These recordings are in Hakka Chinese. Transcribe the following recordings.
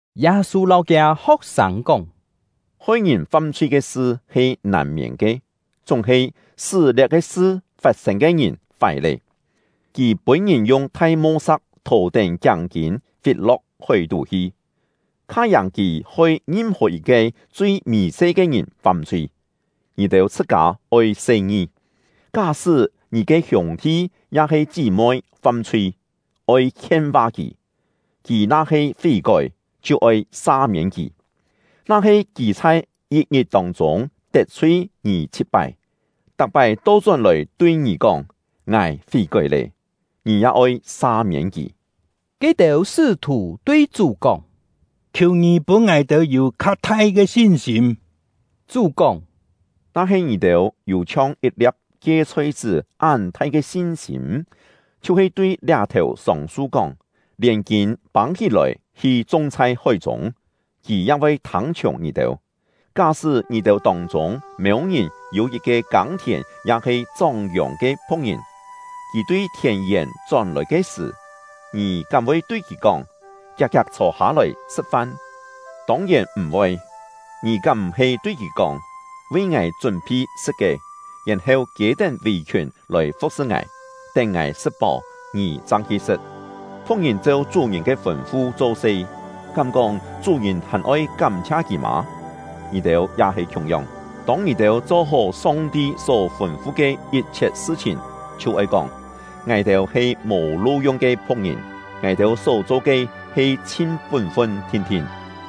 Yâ-sû lâu kiâ ho̍k-sâng kóng: “Hoi ngìn fam-chhui ke sṳ he nàn-miên ke, chúng-he sṳ́ liá-ke sṳ fat-sên ke ngìn fái lé! Kì pûn-ngìn yung thai mo-sa̍k thò-tén kiáng-kîn fit-lo̍k hói-tú hi, kha-yàng kì hoi ngim-hò yit-ke chui mì-se ke ngìn fam-chhui. Ngì-têu chhṳ-kâ oi se-ngi! “Ká-sṳ́ ngì ke hiûng-thi ya-he chí-moi fam-chhui, oi khien-va kì; kì na-he fí-kói, chhiu oi sa-miên kì. Na-he kì chhai yit-ngit tông-chûng tet-chhui ngì chhit-pái, tak-pái to-chón-lòi tui ngì kóng: ‘Ngài fí-kói lé’, ngì ya oi sa-miên kì.” Ke-têu sṳ́-thù tui Chú kóng: “Khiù ngì pûn ngài-têu yû kha thai ke sin-sîm!” Chú kóng: “Na-he ngì-têu yû chhiong yit-lia̍p kie-chhoi-chṳ́ án-thai ke sin-sîm, chhiu-he tui liá-thèu sông-su kóng: ‘Lièn kîn pâng-hí-lòi, hi chung chhai hói-chûng!’ kì ya voi thâng-chhiùng ngì-têu. “Ká-sṳ́ ngì-têu tông-chûng mêu-ngìn yû yit-ke kâng-thièn ya-he chóng-yòng ke phu̍k-ngìn, kì tui thièn-yèn chón-lòi ke sṳ̀, ngì kám voi tui kì kóng: ‘Kiak-kiak chhô-hâ-lòi sṳ̍t-fan!’ Tông-yèn m̀-voi! Ngì kám m̀-he tui kì kóng: ‘Vi ngài chún-phi sṳ̍t ke, yèn-heu kiê-tén vì-khiùn lòi fu̍k-sṳ ngài, tén ngài sṳ̍t-páu, ngì chang hi sṳ̍t!’ Phu̍k-ngìn cheu chú-ngìn ke fûn-fu cho-se, kám-kóng chú-ngìn hàn-oi kám-chhia kì mâ? Ngì-têu ya he khiung-yong; tông ngì-têu cho-hó Song-ti só fûn-fu ke yit-chhiet sṳ-chhìn, chhiu oi kóng: ‘Ngài-têu he mò lu-yung ke phu̍k-ngìn; ngài-têu só-cho ke he chhin pún-fun thin-thin.’”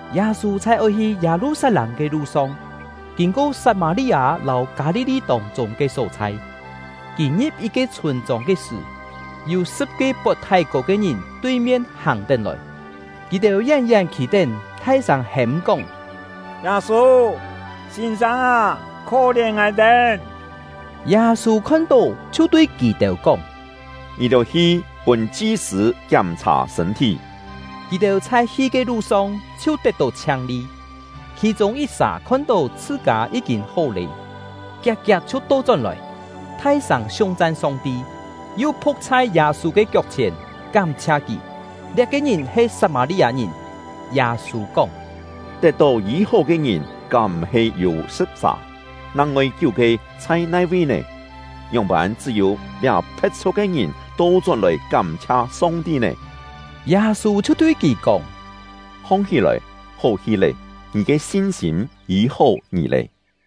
Yâ-sû chhai oi hi Yâ-lu-sat-lâng ke lu-song, kîn-ko Sat-mâ-li-â lâu Kâ-li-li tông-chûng ke só-chhai. Kì ngi̍p yit-ke chhûn-chông ke sṳ̀, yû sṳ̍p-ke pot thái-kô ke ngìn tui-mien hàng-tén lòi. Kì-têu yén-yén khî-tén, thai-sâng hêm-kóng: “Yâ-sû, sîn-sâng â, khó-lièn ngài-têu!” Yâ-sû khon-tó, chhiu tui kì-têu kóng: “Ngì-têu hi pûn chi-sṳ̂ kiám-chhà sṳ̂n-thí!” Kì-têu chhai hi ke lu-song, chhiu tet-tó chhiang-li. Khì-chûng yit-sà khon-tó chhṳ-kâ yí-kîn hó lé, kiak-kiak chhiu to-chón-lòi, thai-sâng siung-chan Song-ti, yu phu̍k chhai Yâ-sû ke kiok-chhièn kám-chhia kì. Liá-ke ngìn he Sat-mâ-li-â-ngìn. Yâ-sû kóng: “Tet-tó yî-hó ke ngìn kám m̀-he yû sṳ̍p-sà? Nang-ngoi kiú-ke chhai nai-vi nè? Ngióng-pân chṳ́-yû liá phe̍t-chhu̍k ke ngìn to-chón-lòi kám-chhia Song-ti nè?” Yâ-sû chhiu tui kì kóng: “Hong-hí-lòi, hó hi lé! Ngì ke sin-sîm yî-hó ngì lé!”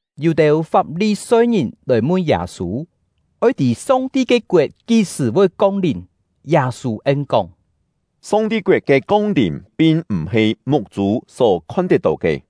Yû-têu Fap-li-soi-ngìn lòi mun Yâ-sû, oi tî Song-ti ke koet kí-sṳ̀ voi kong-lìm. Yâ-sû en-kóng: “Song-ti koet ke kong-lìm pin m̀-he muk-chû só khon-tet-tó ke.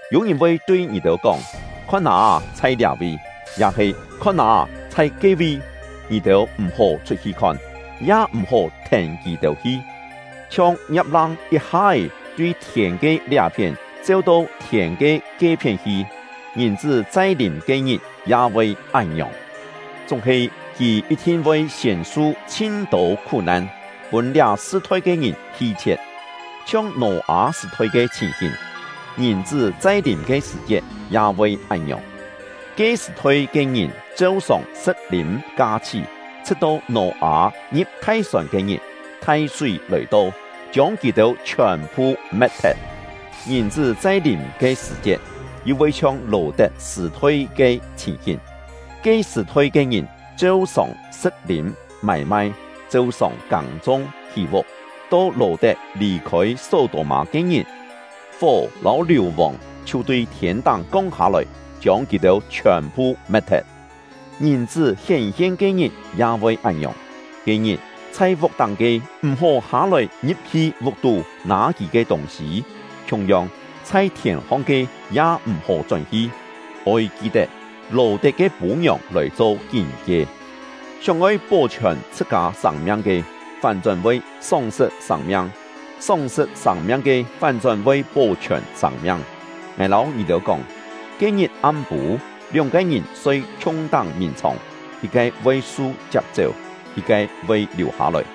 Yû ngìn voi tui ngì-têu kóng: ‘Khon â, chhai liá-vi!’ ya-he ‘Khon â, chhai ke-vi!’ Ngì-têu m̀-hó chhut-hi khon, ya m̀-hó thèn kì-têu hi. Chhiong ngiap-lang yit-ha-é tui thiên ke liá-phién cheu-to thiên ke ke-phién hi, Ngìn-chṳ́ chai-lìm ke-ngit ya voi án-ngiòng. Chúng-he kì yit-thin voi siên su chhin-tô khú-nan, pûn liá sṳ-thoi ke ngìn hi-chhie̍t. Chhiong Nò-â sṳ̀-thoi ke chhìn-hìn, Ngìn-chṳ́ chai-lìm ke sṳ̀-chiet ya voi án-ngiòng. Ke sṳ̀-thoi ke ngìn cheu-sòng sṳ̍t-lîm ka-chhí, chhṳ̍t-to Nò-â ngi̍p thai-sòn ke-ngit, thai-súi lòi-to, chiông kì-têu chhiòn-phu me̍t-thet. Ngìn-chṳ́ chai-lìm ke sṳ̀-chiet, yu voi chhiong Lò-tet sṳ̀-thoi ke chhìn-hìn; ke sṳ̀-thoi ke ngìn cheu-sòng sṳ̍t-lîm, mâi-mai, cheu-sòng kâng-chung, hí-vuk. To Lò-tet lì-khôi Só-tô-mâ ke-ngit, fó lâu liù-vòng chhiu tui thiên-táng kong hâ-lòi, chiông kì-têu chhiòn-phu me̍t-thet. Ngìn-chṳ́ hién-hien ke-ngit ya voi án-ngiòng. “Ke-ngit, chhai vuk-táng ke, m̀-hó hâ-lòi ngi̍p-hi vuk-tú nâ kì ke tûng-sî; khiung-yong, chhai thièn-hong ke, ya m̀-hó chón-hi. Oi ki-tet Lò-tet ke pû-ngiòng lòi cho kín-kie! Sióng-oi pó-chhiòn chhṳ-kâ sâng-miang ke, fán-chón voi sóng-sṳt sâng-miang; sóng-sṳt sâng-miang ke, fán-chón voi pó-chhiòn sâng-miang. Ngài lâu ngì-têu kóng, ke-ngit am-pû, lióng-ke ngìn soi khiung-táng mìn-chhòng, yit-ke voi su chiap-chéu, yit-ke voi liù-hâ-lòi;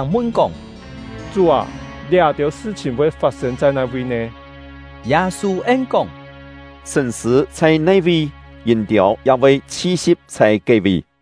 Ho̍k-sâng mun-kóng: “Chú â, liá-têu sṳ-chhìn voi fat-sên chhai nai-vi nè?” Yâ-sû en-kóng: “Sṳ̂n-sṳ̂ chhai nai-vi, yîn-tiâu ya voi chhi-si̍p chhai ke-vi.”